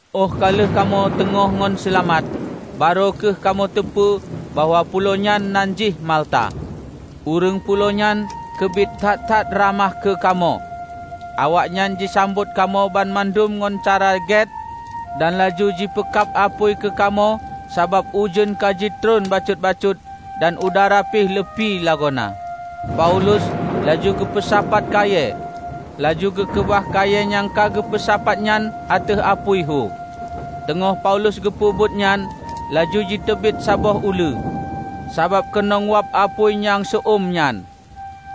Óh ka lheueh kamoe teungoh ngon seulamat, barô kheueh kamoe teupeu bahwa pulo nyan nan jih Malta. Ureuëng pulo nyan keubiet that-that ramah keu kamoe. Awaknyan jisambot kamoe banmandum ngon cara gét dan laju jipeukab apui keukamoe sabab ujeuen ka jitreun bacut-bacut dan udara pih leupie lagoena. Paulus laju geupeusapat kayée, laju geukeubah kayée nyang ka geupeusapat nyan ateueh apui hu. Teungoh Paulus geupeubuet nyan, laju jiteubiet saboh uleue, sabab keunong wab apui nyang seu-eum nyan,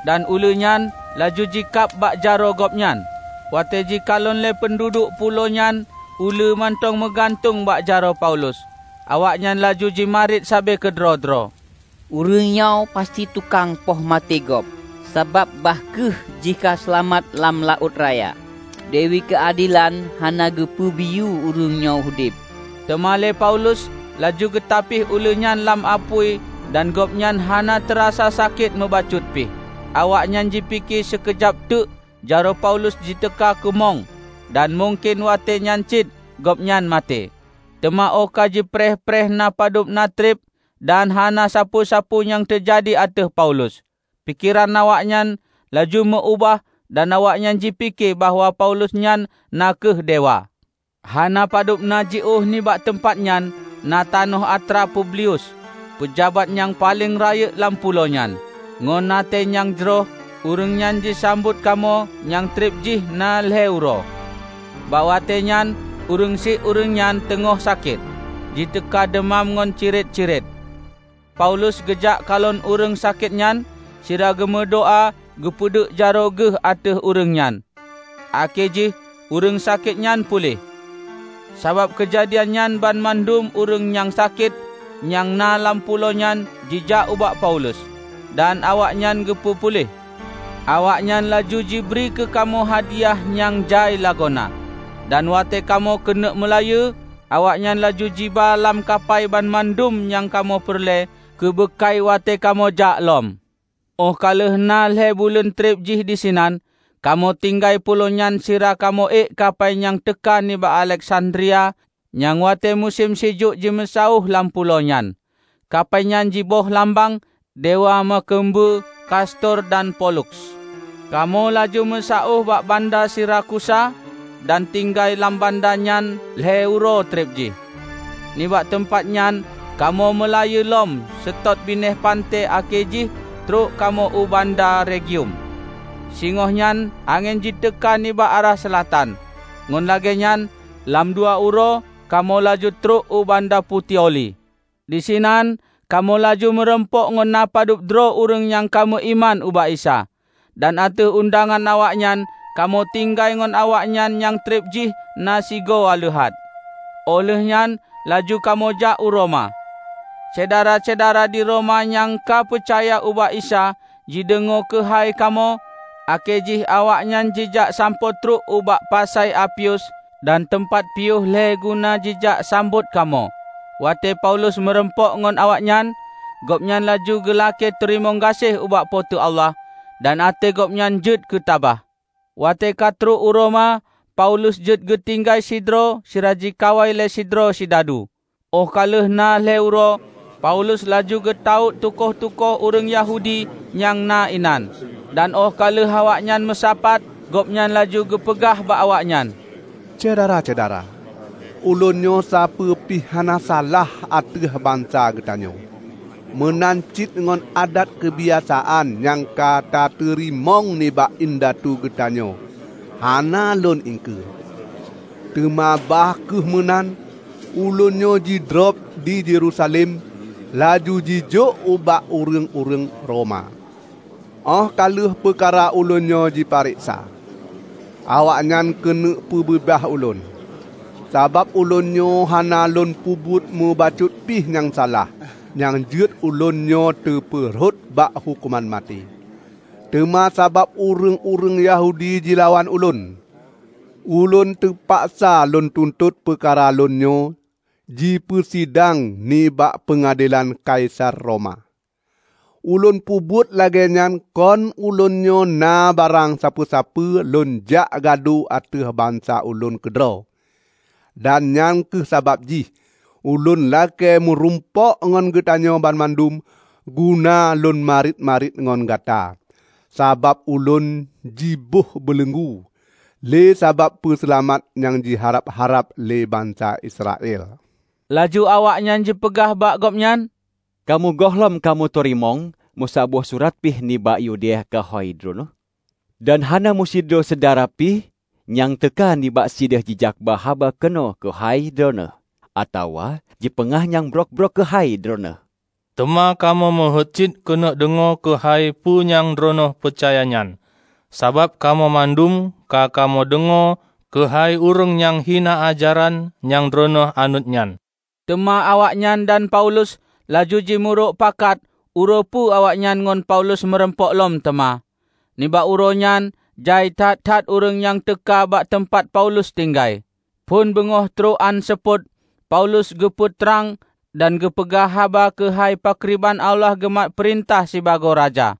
dan uleue nyan laju jikab bak jaroe gobnyan. Watée jikalon lé peunduduek pulo nyan uleue mantong meugantueng bak jaroe Paulus, awaknyan laju jimarit sabe keudroe-droe, "Ureuëng nyoe pasti tukang poh maté gob, sabab bah kheueh jih ka seulamat lam laôt raya, Dewi Keuadelan hana geupeubiyeu ureuëng nyoe udeb." Teuma lé Paulus laju geutapih uleue nyan lam apui dan gobnyan hana teurasa sakét meubacut pih. Awaknyan jipike sikeujab teuk jaroe Paulus jiteuka kumong dan mungken watée nyan cit gobnyan maté. Teuma óh ka jipreh-preh na padub na treb dan hana sapeue-sapeue nyang teujadi ateueh Paulus, pikeran awaknyan laju meu-ubah dan awaknyan jipike bahwa Paulus nyan na kheueh dewa. Hana padub na jiôh nibak teumpat nyan na tanoh atra Publius, peujabat nyang paleng rayeuk lam pulo nyan. Ngon até nyang jroh ureuëng nyan jisambot kamoe nyang treb jih na lhée uroe. Bak watée nyan ureuëng syiek ureuëng nyan teungoh sakét, jiteuka deumam ngon ciret-ciret. Paulus geujak kalon ureuëng sakét nyan sira geumeudoá geupeuduek jaroe geuh ateueh ureuëng nyan, akhé jih ureuëng sakét nyan puléh. Sabab keujadian nyan banmandum ureuëng nyang sakét nyang na lam pulo nyan jijak ubak Paulus, dan awaknyan geupeu puléh. Awaknyan laju jibri keukamoe hadiah nyang jai lagoena, dan watée kamoe keuneuk meulayeue, awaknyan laju jiba lam kapai banmandum nyang kamoe peureulée keubeukai watée kamoe jak lom. Óh ka lheueh na lhée buleuen treb jih disinan, kamoe tinggai pulo nyan sira kamoe ék kapai nyang teuka nibak Aleksandria nyang watée musém sijuek jimeusaôh lam pulo nyan. Kapai nyan jiboh lambang "Dewa Meukeumbeue Kastor dan Poluks". Kamoe laju meusaôh bak banda Sirakusa dan tinggai lam banda nyan lhée uroe treb jih. Nibak teumpat nyan kamoe meulayeue lom seutôt binéh panté akhé jih trok kamoe u banda Regium. Singoh nyan angén jiteuka nibak arah seulatan, ngon lagée nyan lam dua uroe kamoe laju trok u banda Putioli. Disinan kamoe laju meurumpok ngon napadub droe ureuëng nyang ka meuiman ubak Isa, dan ateueh undangan awaknyan kamoe tinggai ngon awaknyan nyang treb jih na sigoe aleuhat. Óh lheueh nyan laju kamoe jak u Roma. Syedara-syedara di Roma nyang ka peucaya ubak Isa jideungoe keuhai kamoe, akhé jih awaknyan jijak sampoe trok ubak Pasai Apius dan Teumpat piôh Lhée guna jijak sambot kamoe. Watée Paulus meurumpok ngon awaknyan, gobnyan laju geulakée teurimong gaséh ubak Po teu Allah dan até gobnyan jeuet keutabah. Watée ka trok u Roma, Paulus jeuet geutinggai sidroe sira jikawai lé sidroe sidadu. Óh ka lheueh na lhée uroe, Paulus laju geutawök tukoh-tukoh ureuëng Yahudi nyang na inan. Dan óh ka lheueh awaknyan meusapat, gobnyan laju geupeugah bak awaknyan, "Syedara-syedara! Ulôn nyoe sapeue pih hana salah ateueh bansa geutanyoe, meunan cit ngon adat keubiasaan nyang ka tateurimong nibak indatu geutanyoe hana lôn iengkeue. Teuma bah kheueh meunan ulôn nyoe jidrob di Yerusalem laju jijok ubak ureuëng-ureuëng Roma. Óh ka lheueh peukara ulôn nyoe jipareksa, awaknyan keuneuk peubeubaih ulôn, sabab ulôn nyoe hana lôn peubuet meubacut pih nyang salah nyang jeuet ulôn nyoe teupeurhot bak huköman maté. Teuma sabab ureuëng-ureuëng Yahudi jilawan ulôn, ulôn teupaksa lôn tuntot peukara lôn nyoe jipeusidang nibak peungadelan Kaisar Roma. Ulôn peubuet lagée nyan kon ulôn nyoe na barang sapeue-sapeue lôn jak gadu ateueh bansa ulôn keudroe. Dan nyang kheueh sabab jih ulôn lakée meurumpok ngon gatanyoe banmandum guna lôn marit-marit ngon gata; sabab ulôn jiboh beuleunggu, lé sabab Peuseulamat nyang jiharab-harab lé bansa Israel." Laju awaknyan jipeugah bak gobnyan, "Kamoe gohlom kamoe teurimong meusaboh surat pih nibak Yudea keuhai Droeneueh. Dan hana meusidroe syedara pih nyang teuka nibak sideh jijakba haba keunoe keuhai droeneueh atawa jipeugah nyang brok-brok keuhai Droeneueh. Teuma kamoe meuheuét cit keuneuk deungoe keuhai peue nyang Droeneueh peucaya nyan, sabab kamoe mandum ka kamoe deungoe keuhai ureuëng nyang hina ajaran nyang Droeneueh anut nyan." Teuma awaknyan dan Paulus laju jimeurok pakat uroe peu awaknyan ngon Paulus meurumpok lom teuma, nibak uroe nyan jai that-that ureuëng nyang teuka bak teumpat Paulus tinggai. Phon beungoh trok án seupôt Paulus geupeu trang dan geupeugah haba keuhai pakriban Allah geumat peurintah sibagoe Raja.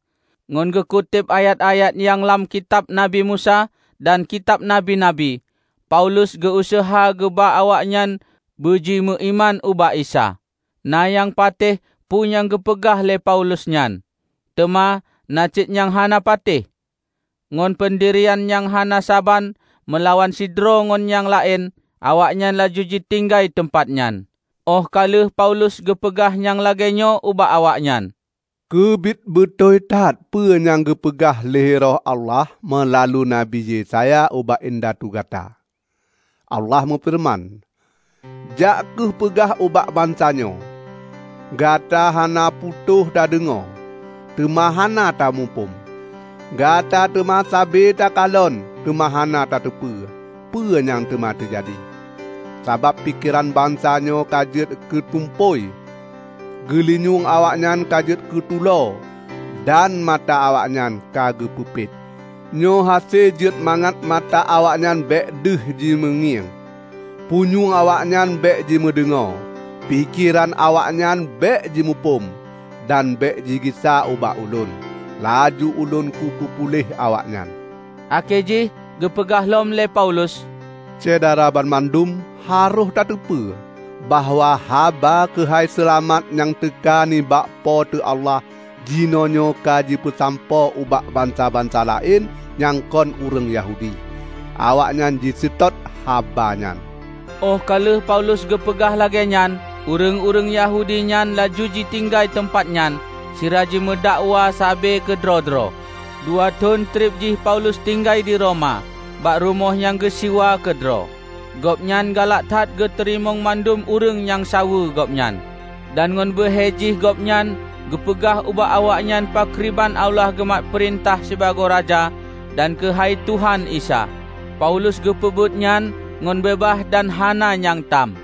Ngon geukuteb ayat-ayat nyang lam Kitab Nabi Musa dan Kitab Nabi-nabi, Paulus geu-useuha geuba awaknyan beuji meuiman ubak Isa. Na nyang patéh peue nyang geupeugah lé Paulus nyan, teuma na cit nyang hana patéh. Ngon peundirian nyang hana saban meulawan sidroe ngon nyang laén awaknyan laju jitinggai teumpat nyan, óh ka lheueh Paulus geupeugah nyang lagée nyoe ubak awaknyan, "Keubiet beutôi that peue nyang geupeugah lé Roh Allah meulalu Nabi Yesaya ubak indatu gata! Allah meufeureuman, 'Jak kheueh peugah ubak bansa nyoe: Gata hana putôh tadeungoe, teuma hana tamuphom; gata teuma sabe takalon teuma hana tateupeue peue nyang teuma teujadi. Sabab pikeran bansa nyoe ka jeuet keu tumpôi, geulinyueng awaknyan ka jeuet keutulo, dan mata awaknyan ka geupeupet. Nyoe hase jeuet mangat mata awaknyan bék deuh jimeungieng, punyueng awaknyan bék jimeudeungoe, pikeran awaknyan bék jimuphom, dan bék jigisa ubak Ulôn, laju Ulôn kupeupuléh awaknyan.' " Akhé jih geupeugah lom lé Paulus, "Syedara banmandum harôh tateupeue bahwa haba keuhai seulamat nyang teuka nibak Po teu Allah jinoenyoe ka jipeusampoe ubak bansa-bansa laén nyang kon ureuëng Yahudi. Awaknyan jiseutôt haba nyan!" Óh ka lheueh Paulus geupeugah lagée nyan, ureuëng-ureuëng Yahudi nyan laju jitinggai teumpat nyan sira jimeudakwa sabe keudroe-droe. Dua thon treb jih Paulus tinggai di Roma, bak rumoh nyang geusiwa keudroe. Gobnyan galak that geuteurimong mandum ureuëng nyang saweue gobnyan. Dan ngon beuhe jih gobnyan geupeugah ubak awaknyan pakriban Allah geumat peurintah sibagoe Raja dan keuhai Tuhan Isa. Paulus geupeubuet nyan ngon beubaih dan hana nyang tam.